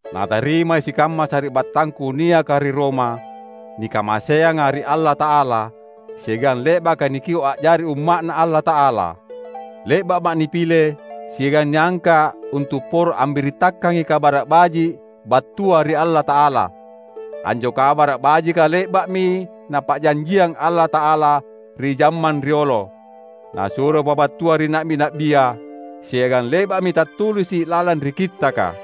Natarimai sikamma sari’battangku niaka ri Roma, nikamaseanga ri Allata’ala, siagang le’baka nikio’ a’jari umma’Na Allata’ala. Le’ba’ma’ nipile siagang niangka’ untu’ poro ambirittakangi Kabara’ Baji’ battua ri Allata’ala. Anjo Kabara’ Bajika le’ba’mi Napa’janjiang Allata’ala ri jammang riolo, Nasuro pabattua ri na’bi-na’bia, siagang le’ba’mi tattulisi’ lalang ri Kittaka.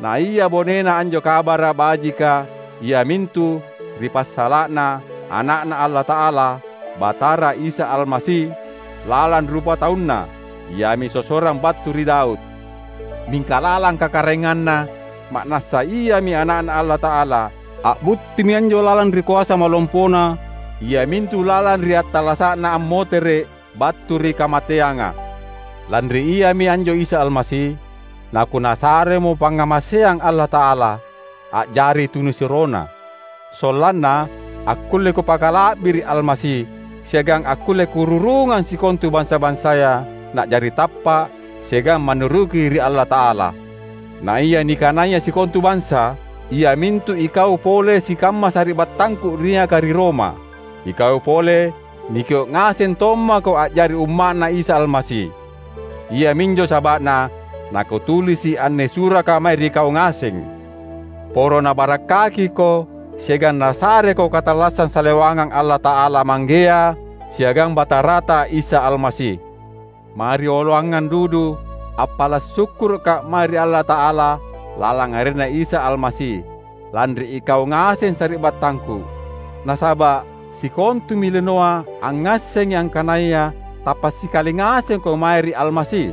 Naia bonena anjo Kabara’ Bajika iamintu ri passala’na Ana’Na Allata’ala, Batara Isa Almasi. Lalang rupatauna, Iami sossorang battu ri Daud; mingka lalang kakaraenganna, ma’nassa Iami Ana’Na Allata’ala. A’buttimi anjo lalang ri koasa malompoNa, iamintu lalang ri attallasa’Na ammotere’ battu ri kamateanga. Lanri Iami anjo Isa Almasi, nakuNasaremo pangngamaseang Allata’ala, a’jari tunisuroNa. Sollanna, akkulle kupakala’biri’ Almasi, siagang akkulle kururungang sikontu bansa-bansaya na’jari tappa’ siagang mannuruki ri Allata’ala. Naia nikanaya sikontu bansa, iamintu ikau pole sikamma sari’battangku niaka ri Roma; ikau pole, nikio’ ngaseng tommako a’jari umma’Na Isa Almasi. Iaminjo saba’na nakutulisi’ anne suraka mae ri kau ngaseng. Poro Nabarakkakiko siagang Nasareko katallassang salewangang Allata’ala Manggea siagang Batarata Isa Almasi. Marioloangang dudu, appala’ sukkuruka’ mae ri Allata’ala lalang arenNa Isa Almasi, lanri ikau ngaseng sari’battangku. Nasaba’ sikontumi linoa angngassengi angkanaya tappa’ sikali ngasengko mae ri Almasi.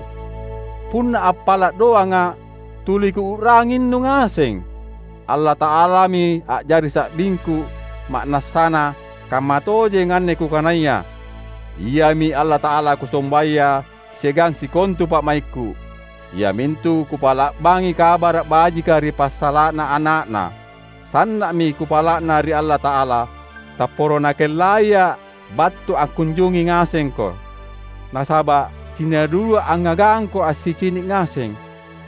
Punna appala’ doanga’ tuli kuu’ranginnu ngaseng. Allata’alami a’jari sa’bingku ma’nassana kammatojeng anne kukanaya. Iami Allata’ala kusombaya siagang sikontu pa’maikku, iamintu kupa’la’bangi Kabara’ Bajika ri passala’na Ana’Na. Sanna’mi kupala’na ri Allata’ala, tapporo Nakellaia’ battu angkunjungi ngasengko. Nasaba’ cinna dudua’ angngagangko assicini’ ngaseng,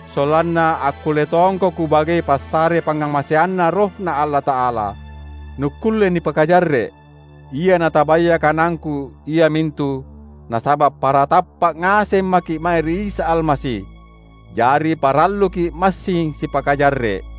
sollanna akkulle tongko kubagei passare pangngamaseanNa RohNa Allata’ala, nukkulle nipakajarre’. Ia natabaya kanangku iamintu, nasaba’ para tappa’ ngaseng maki’ mae ri Isa Almasi, jari paralluki’ massing sipakajarre’.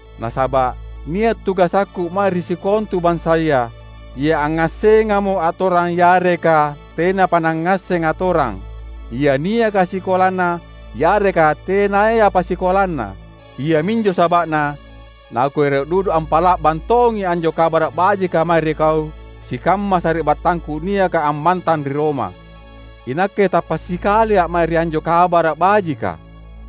Nasaba’ nia’ tugasakku mae ri sikontu bansaya: ia angngassengamo atorang yareka tenapa nangngasseng atorang, ia niaka sikolana yareka tenayapa sikolana. Iaminjo saba’na nakuero’ dudu ampa’la’bang tongi anjo Kabara’ Bajika mae ri kau sikamma sari’battangku niaka ammantang ri Roma. Inakke tappa’ sikalia’ mae ri anjo Kabara’ Bajika,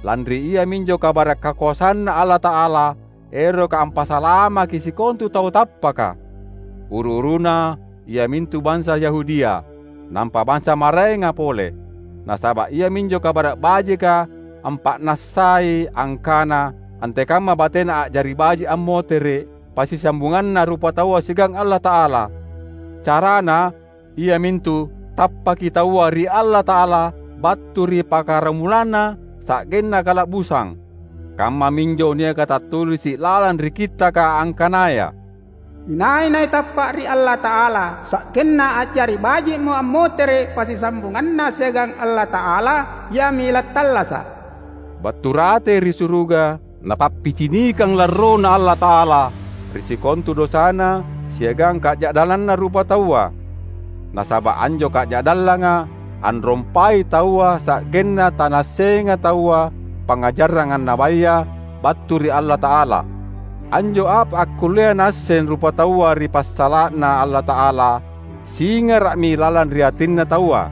lanri iaminjo kabara’ kakoasanNa Allata’ala eroka ampasalamaki sikontu tau tappaka; uru-uruna iamintu bansa Yahudia, nampa bansa maraenga pole. Nasaba’ iaminjo Kabara’ Bajika ampa’nassai angkana antekamma batena a’jari baji’ ammotere’ passisambunganna rupataua siagang Allata’ala. Carana, iamintu tappaki taua ri Allata’ala battu ri pakaramulanna sa’genna kala’busang. Kammaminjo niaka tattulisi’ lalang ri Kittaka angkanaya, "Inai-nai tappa’ ri Allata’ala sa’genna a’jari baji’mo ammotere’ passisambunganna siagang Allata’ala, iami lattallasa’!" Battu ratei ri suruga Napappicinikang larroNa Allata’ala ri sikontu dosana siagang kaja’dallanna rupataua. Nasaba’ anjo kaja’dallanga anrompai taua sa’genna tanaassenga taua pangngajarang annabaya battu ri Allata’ala. Anjo apa akkullea naasseng rupataua ri passala’na Allata’ala singara’mi lalang ri atinna taua,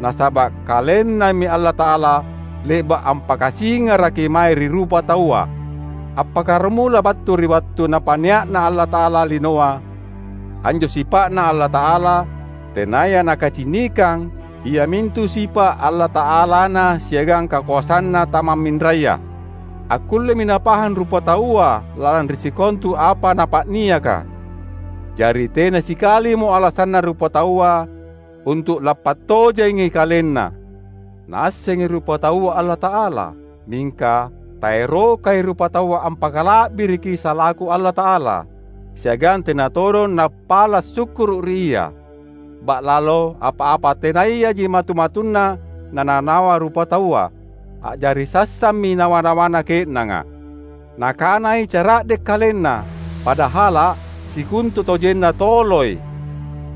nasaba’ KalenNami Allata’ala le’ba’ ampakasingaraki mae ri rupataua. Appakkaramula battu ri wattu Napa’nia’na Allata’ala linoa, anjo sipa’Na Allata’ala tenaya nakacinikang, iamintu sipa’ Allata’alaNa siagang kakoasanNa tamamminraya, akkullemi napahang rupataua lalang ri sikontu apa Napa’niaka. Jari tena sikalimo alasanna rupataua untu’ lampattojengi kalenna. Naassengi rupataua Allata’ala, mingka taerokai rupataua ampakala’biriki salaku Allata’ala, siagang tena todong nappala’ sukkuru’ ri Ia. Ba’lalo apa-apa tenayaji matu-matunna nanawa-nawa rupataua; a’jari sassammi nawa-nawanna ke’nanga. Nakanai cara’de’ kalenna, padahala’ sikontutojenna toloi.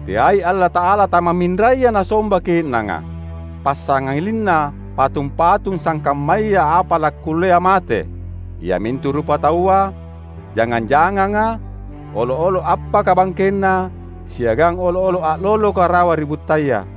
Teai Allata’ala tamamminraya nasomba ke’nanga, passangalinna patung-patung sangkammaya apa lakkullea mate; iamintu rupataua, jangang-janganga, olo’-olo’ appaka bangkenna, siagang olo’-olo’ a’loloka rawa ri buttaya.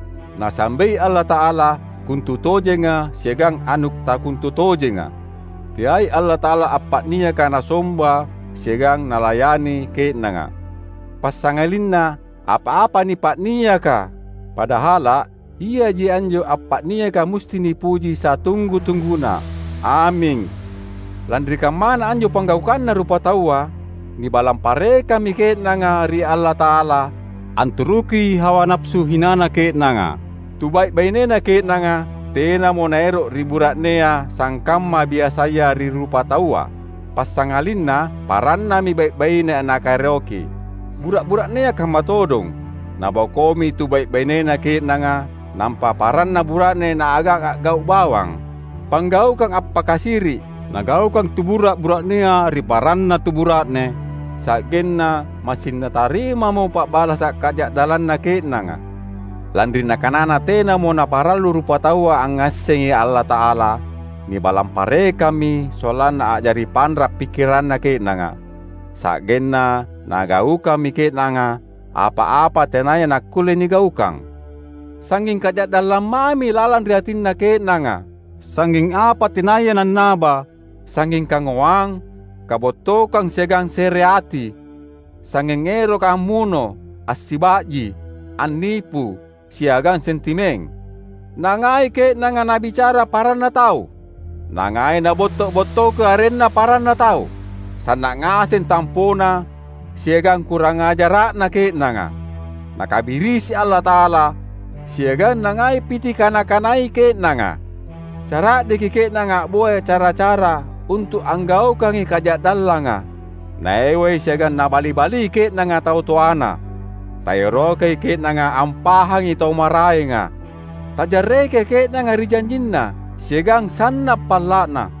Nasambei Allata’ala kontutojenga siagang anu takontutojenga. Teai Allata’ala appa’niaka nasomba siagang nalayani ke’nanga, passangalinna apa-apa nipa’niaka. Padahala’ iaji anjo appa’niaka musti nipuji satunggu-tungguna! Aming. Lanri kammana anjo panggaukanna rupataua, nibalang parekammi ke’nanga ri Allata’ala anturuki hawa napasu hinana ke’nanga. Tubai’-bainena ke’nanga tenamo naero’ ri bura’nea sangkamma biasaya ri rupataua, passangalinna parannami bai’-baine nakaeroki. Bura’-bura’nea kamma todong; nabokoimi tubai’-bainena ke’nanga, nampa paranna bura’ne naagang a’gau’ bawang. Panggaukang appakasiri’ nagaukang tubura’-bura’nea ri paranna tu bura’ne, sa’genna massing natarimamo pa’balasa’ kaja’dallanna ke’nanga. Lanri nakanana tenamo naparallu rupataua angngassengi Allata’ala, nibalang parekammi sollanna a’jari panra’ pikkiranna ke’nanga; sa’genna nagaukammi ke’nanga apa-apa tenaya nakkulle nigaukang. Sangnging kaja’dallang mami lalang ri atinna ke’nanga, sangnging apa tenaya nannaba; sangnging kangoang, kabottokang siagang sereati; sangnging eroka ammuno, assiba’ji, annipu, siagang sentimeng. Nangai ke’nanga nabicara paranna tau, nangai nabotto’-bottoki arenna paranna tau; sanna’ ngaseng tampona siagang kurangajara’na ke’nanga; nakabirisi Allata’ala siagang nangai pitikana-kanai ke’nanga. Cara’deki ke’nanga a’boya cara-cara untu’ anggaukangi kaja’dallanga. Naewai siagang nabali-bali ke’nanga tau toana; taerokai ke’nanga ampahangi tau maraenga; tajarrekai ke’nanga ri janjinna siagang sanna’ palla’na.